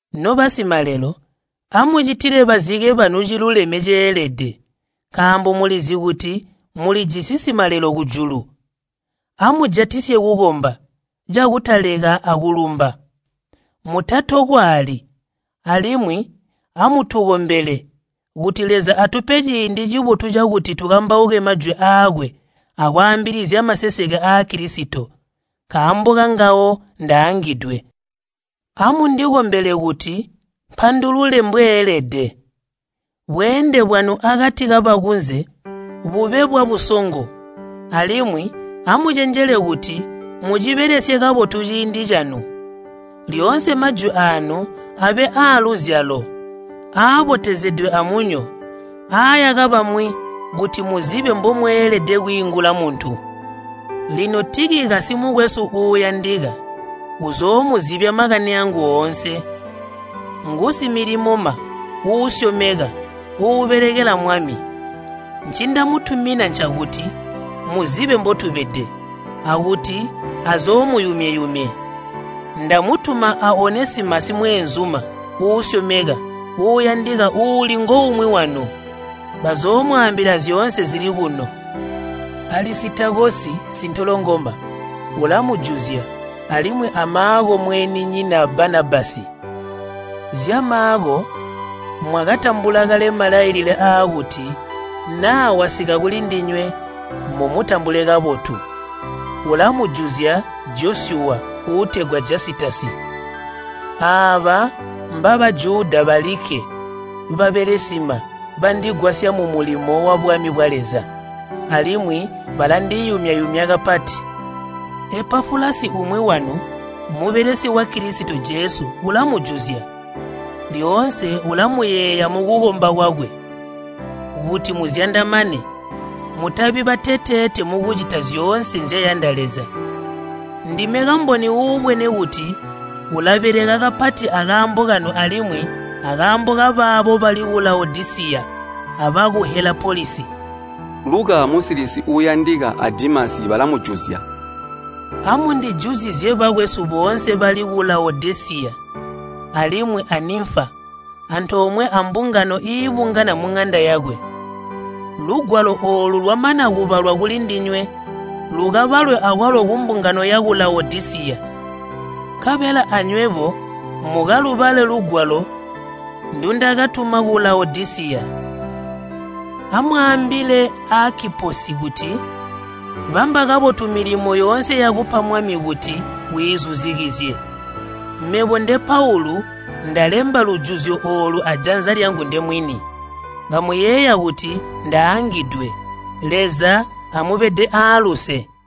Nobasimalelo, amucitile bazike banu ciluleme ceelede, nkaambo mulizi kuti mulijisi Simalelo kujulu. Amujatisye kukomba cakutaleka akulumba, mutatokwaali. Alimwi amutukombele, kuti Leza atupe ciindi cibotu cakuti tukambauke majwi aakwe akwaambilizya maseseke aa Kilisito. Nkaambo kangawe ndaangidwe. Amundikombele kuti mpandulule mbweelede. Bweende bwanu akati kabakunze bube bwabusongo, alimwi amucenjele kuti mucibelesye kabotu ciindi canu. Lyoonse majwi aanu abe aaluzyalo aayaka bamwi kuti muzibe mbomweelede kwiingula muntu. Lino Tikikasi mukwesu uuyandika uzoomuzibya makani aangu oonse. Ngusimilimoma uusyomeka uubelekela Mwami. Ncindamutumina ncakuti muzibe mbotubede, akuti azoomuyumye-yumye. Ndamutuma a Onesimasi mweenzuma uusyomeka uuyandika uuli ngoumwi wanu. Bazoomwaambila zyoonse zili kuno. Alisitakosi sintolongoma ulamujuzya alimwi a Maako mweenzinyina Banabasi. Zya Maako mwakatambula kale malailile aakuti naa wasika kulindinywe, mumutambule kabotu. Ulamujuzya Josyuwa uutegwa Jasitasi. Aaba mba Bajuda balikke babelesima bandigwasya mumulimo wabwami bwa Leza, alimwi balandiyumya-yumya kapati. Epafulasi umwi wanu, mubelesi wa Kilisito Jesu ulamujuzya. Lyoonse ulamuyeeya mukukomba kwakwe, kuti muzyandamane, mutabi bateteete mukucita zyoonse nzyayanda Leza. Ndime kamboni uubwene kuti ulabeleka kapati akaambo kanu alimwi akaambo kabaabo bali ku Lawodisiya abaku Helapolisi. Luka musilisi uuyandika a Dimasi balamujuzya. Amundijuzizye bakwesu boonse bali ku Lawodisiya alimwi a Nimfa antoomwe ambungano iibungana muŋanda yakwe. Lugwalo oolu lwamana kubalwa kulindinywe, lukabalwe akwalo kumbungano yaku Lawodisiya, nkabela anywebo mukalubale lugwalo ndundakatuma ku Lawodisiya. Amwaambile Aakiposi kuti, “Bamba kabotu milimo yoonse yakupa Mwami kuti wiizuzikizye.” Mebo nde Paulu, ndalemba lujuzyo oolu ajanza lyangu ndemwini. Kamuyeeya kuti ndaangidwe. Leza amubede aaluse.